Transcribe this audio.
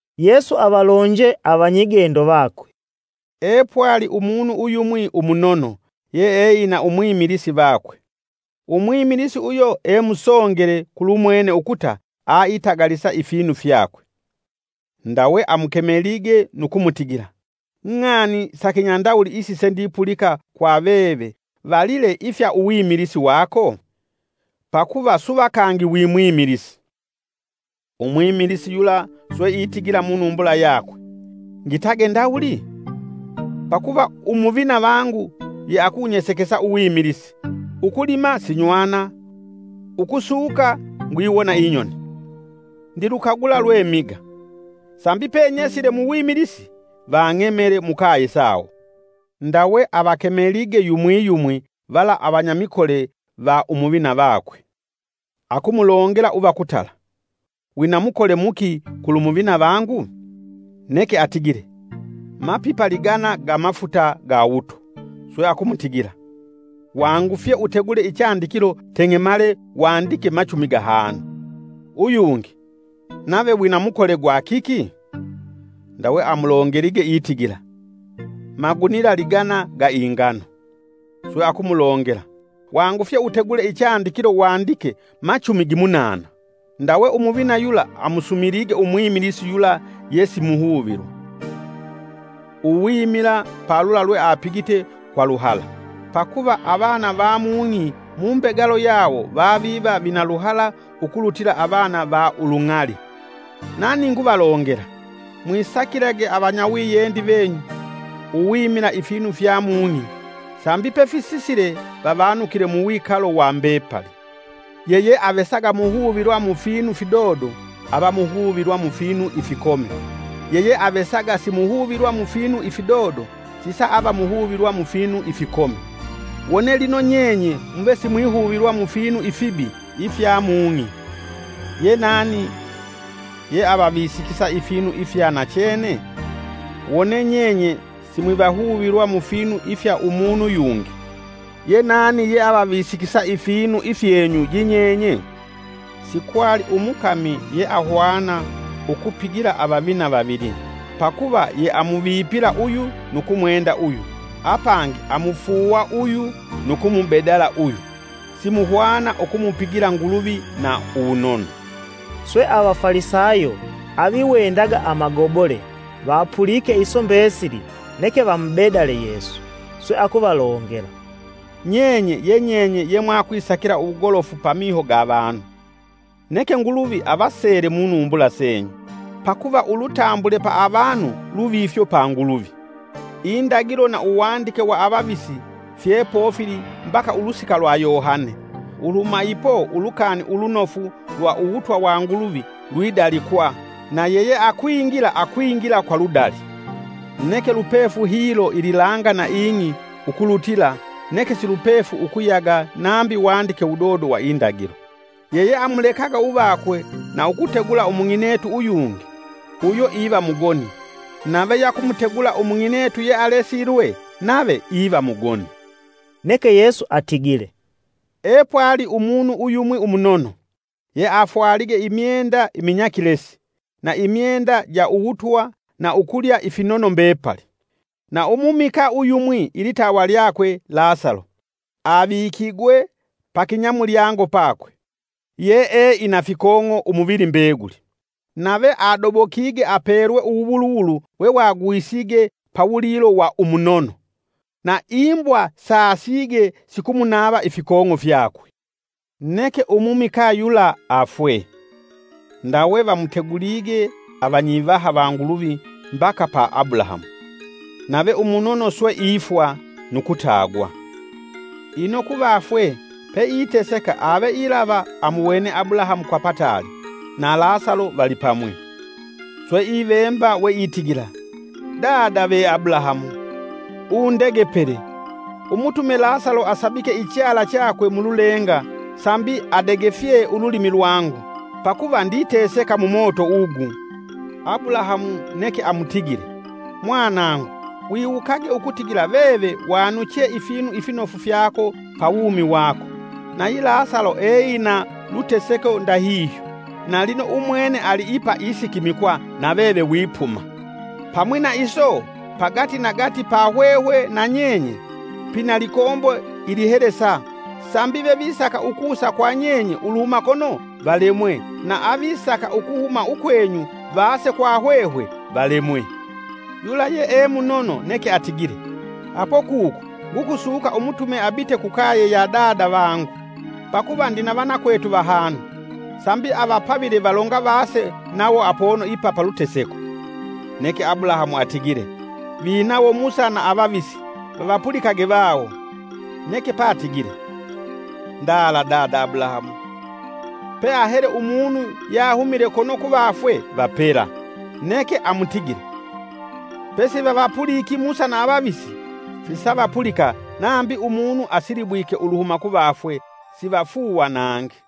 Yesu avalonje avanyigendo vakwe, “Epwali umunu uyumwi umunono yeeina umwimilisi vakwe. Umwimilisi uyo emusongele kulumwene ukuta aitagalisa ifinu fyakwe. Ndawe amukemelige nu kumutigila: ‘Ng'ani sa kinyandawuli isi sendipulika kwa veve valile ifya uwimilisi wako? Pakuva suva kangi wi mwimilisi’ Umwimilisi yula swe itigila munumbula yakwe: ‘Ngitage ndawuli? Pakuva umuvina vangu yeakunyesekesa uwimilisi; ukulima sinywana, ukusuka ngwiwona inyoni. Ndilukagula lwe miga, sambi penyesile muwimilisi, vang'emele mukaye sawo.’ Ndawe avakemelige yumwi yumwi vala avanyamikole va umuvina vakwe, akumulongela uva kutala: ‘Wina mukole muki kulu muvina vangu?’ Neke atigile: ‘Mapipa ligana ga mafuta ga wuto.’ Swe akumutigila: ‘Wangufye utegule ichandikilo teng'emale wandike machumi gahanu.’ Uyungi: ‘Nave wina mukole gwa kiki?’ Ndawe amulongelige itigila: ‘Magunila ligana ga ingano.’ Swe akumulongela: ‘Wangufye utegule ichandikilo wandike machumi gimunana.’ “Ndawe umuvina yula amusumilige umwimilisi yula yesimuhuvilwa, uwimila palula lweapigite kwa luhala. Pakuva avana va mung'i mumbegalo yawo vaviva vina luhala ukulutila avana va ulung'ali.” Nani nguvalongela, “Mwisakilage avanyawiyendi venyu uwimila ifinu fya mung'i, sambi pefisisile vavanukile muwikalo wa mbepali. Yeyeavesaga muhuvilwa mufinu fidodo ava muhuvilwa mufinu ifikomi, yeyeavesaga simuhuvilwa mufinu ifidodo sisa ava muhuvilwa mufinu ifikomi. Wone lino nyenye muve simwihuvilwa mufinu ifibi ifya mung'i, ye nani yeavavisikisa ifinu ifya nachene? Wone nyenye simwivahuvilwa mu finu ifya umunu yungi, ye nani yeavavisikisa ifinu ifyenyu yinyenye? “Sikwali umukami yeahwana ukupigila avavina vavili, pakuva yeamuvipigila uyu nu kumwenda uyu, apangi amufuuwa uyu nu kumubedala uyu. Simuhwana ukumupila Nguluvi na uwunono.” Swe Avafalisayo aviwendaga amagobole vapulike iso mbesili neke vamubedale Yesu. Swe akuvalongela, “Nyenye ye nyenye yemwakisakila uwugolofu pamiho ga vanu, neke Nguluvi avasele munumbula senyu, pakuva ulutambule pa avanu luvifyo pa Nguluvi. “Indagilo na uwandike wa avavisi fyepofili mbaka ulusika lwa Yohane. Uluhuma ipo Ulukani Ulunofu lwa uwutwa wa Nguluvi lwidalikwa, na yeyeakwingila akwingila kwa ludali. Neke lupefu hilo ililanga na ing'i ukulutila, neke silupefu ukuyaga nambi wandike wudodo wa Indagilo. “Yeyeamulekaga uvakwe na ukutegula umung'inetu uyungi, uyo iva mugoni nave yakumutegula umung'inetu yealesilwe nave iva mugoni.” Neke Yesu atigile, “Epwali umunu uyumwi umunono, yeafwalige imyenda iminyakilesi, na imyenda ja uwutwa na ukulya ifinono mbepali. Na umumikaa uyumwi ilitawa lyakwe Lasalo, avikigwe pakinyamulyango pakwe, yee ina fikong'o umuvili mbeguli, nave adobokige apelwe uwuwuluwulu wewagwisige pawulilo wa umunono, na imbwa saasige sikumunava ifikong'o fyakwe! “Neke umumikaa yula afwe, ndawe vamutegulige vanyivaha va Nguluvi mbaka pa Abulahamu. Nave umunono swe ifwa nu kutagwa. Ino kuvafwe peiteseka ave ilava amuwene Abulahamu, kwa pataali na Lasalo valipamwi. Swe, ivemba weitigila: ‘Dada ve Abulahamu, undegepele, umutume Lasalo asabike ichala chakwe mululenga sambi adegefye ululimi lwangu, pakuva nditeseka mumoto ugu.’ Abulahamu neke amutigile: ‘Mwanangu, wiwukage ukutigila veve wanuchee ifinu ifinofu fyako pa wumi wako, nayi Lasalo eina luteseko ndahihyo. Na lino umwene ali ipa isikimikwa na veve wipuma. Pamwi na iso, pagati nagati pa hwehwe na nyenye pina likombo ilihelesa, sambi vevisaka ukusa kwa nyeye uluhuma kono valemwe, na avisaka ukuhuma ukwenyu vaase kwa hwehwe valemwe.’ Yula yee munono neke atigile, ‘Apo kuku ngukusuka umutume abite kukaye ya dada vangu, pakuva ndina vanakwetu vahanu, sambi avapavile valonga vaase nawo apono ipa paluteseko.’ Neke Abulahamu atigile: ‘Vinawo Musa na avavisi; vavapulikage vawo.’ Neke patigile: ‘Ndala, dada Abulahamu, peahele umunu yahumile kono kuvafwe vapela.’ Neke amutigile: ‘pesivavapuliki Musa na avavisi, sisavapulika nambi umunu asilibwike uluhuma kuvafwe, sivafuuwa nangi.’”